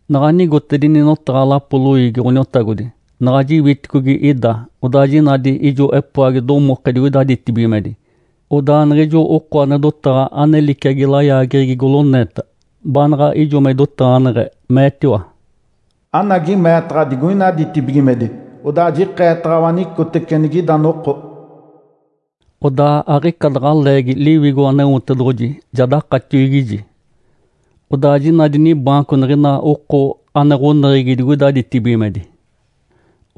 Naɡ̶a nigotedini notaɡ̶a lapoli loiigi Ǥoniotagodi, naɡ̶a jiwiticogi ida, odaa jinadi ijo epoagi domoke digoida ditibigimedi. Odaa niɡ̶ijo oko ane dotaɡ̶a ane liciagi layaageɡ̶egi goloneeta, baanaɡ̶a ijo me idotaɡ̶aneɡ̶e, meetiwa, “Anagi meetaɡ̶a digoina ditibigimedi! Odaa jikeetaɡ̶awa anicotece anigida noko.” Odaa aɡ̶ica daɡ̶a leegi Liwigo Aneotedoɡ̶oji ja dakatiwigiji. Odaa jinadi nibaanco niɡ̶ina oko ane ɡ̶oneɡ̶egi digoida ditibigimedi.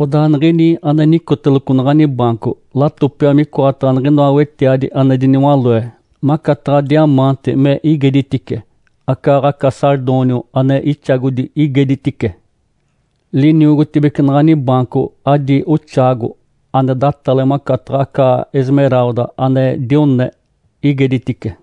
Odaa niɡ̶ini ane nicoteloco naɡ̶ani baanco, latopiwa micoataɡ̶a niɡ̶inoa wetiadi ane diniwaloe, macataɡ̶a “diamante” me igeditice, acaaɡ̶aca “sardônio” ane ixagodi igeditice. Liniogotibece naɡ̶ani baanco adi oxaago ane datale macataɡ̶a aca “esmeralda” ane dione igeditice.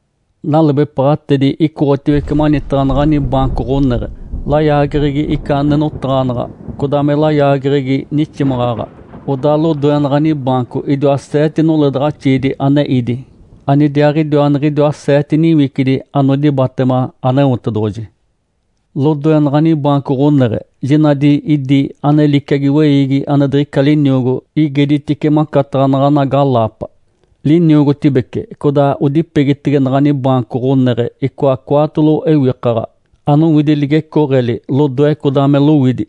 Nalebepaɡ̶atedi icoɡ̶otiwece manitaɡ̶a naɡ̶ani baanco ɡ̶oneɡ̶e, layaageɡ̶egi ica ane notaɡ̶anaɡ̶a codaa me layaageɡ̶egi niximaɡ̶aɡ̶a. Odaa lodoe naɡ̶ani baanco idiwa seete noledaɡ̶axiidi ane ídi, anidiaaɡ̶idiwa niɡ̶idiwa seete niwicidi anodibatema Aneotedoɡ̶oji. Lodoe naɡ̶ani baanco ɡ̶oneɡ̶e jinadi idi ane liciagi weiigi ane diɡ̶ica liniogo igeditice macataɡ̶a naɡ̶ana galaapa. Liniogotibece codaa odipegitege naɡ̶ani baanco ɡ̶oneɡ̶e icoa cwaatolo ewikaɡ̶a, anowidi ligecooɡ̶eli lodoe codaa me lowidi.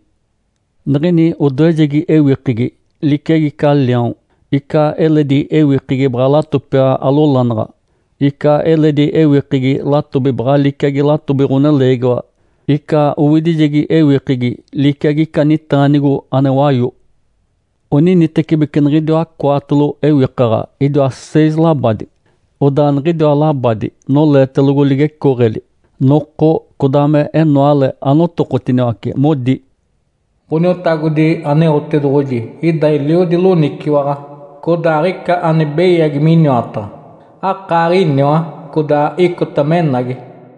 Niɡ̶ini odoejegi ewikegi liciagi ica liaon, ica eledi ewikegi baɡ̶a latopiwa alolanaɡ̶a, ica eledi ewikegi latobi baɡ̶a liciagi latobi ɡ̶oneleegiwa, ica owidijegi ewikegi liciagi ica nitaanigo ane wayo. Oninitecibeci niɡ̶idiwa cwaatolo ewikaɡ̶a idiwa seis labadi. Odaa niɡ̶idiwa labadi noleetelogo ligecooɡ̶eli. Noko codaa menoale anotokotiniwace, modi, “Ǥoniotagodi Aneotedoɡ̶oji ida eliodi loniciwaɡ̶a, codaa aɡ̶ica ane beyagi miniwataɡ̶a. Akaaɡ̶iniwa, codaa icota menagi.”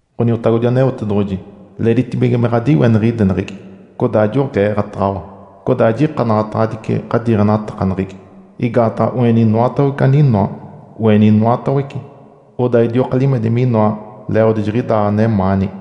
“Ǥoniotagodi Aneotedoɡ̶oji leeditibige me ɡ̶adiweniɡ̶ideneɡ̶egi codaa joɡ̶eeɡ̶ataɡ̶awa, codaa jikanaɡ̶ataɡ̶adici ɡ̶adiiɡ̶enatakaneɡ̶egi. Igaataɡ̶a oeni inoatawece aninoa. Oeni inoatawece, odaa idioka limedi minoa leeɡ̶odi jiɡ̶idaa anemaani.”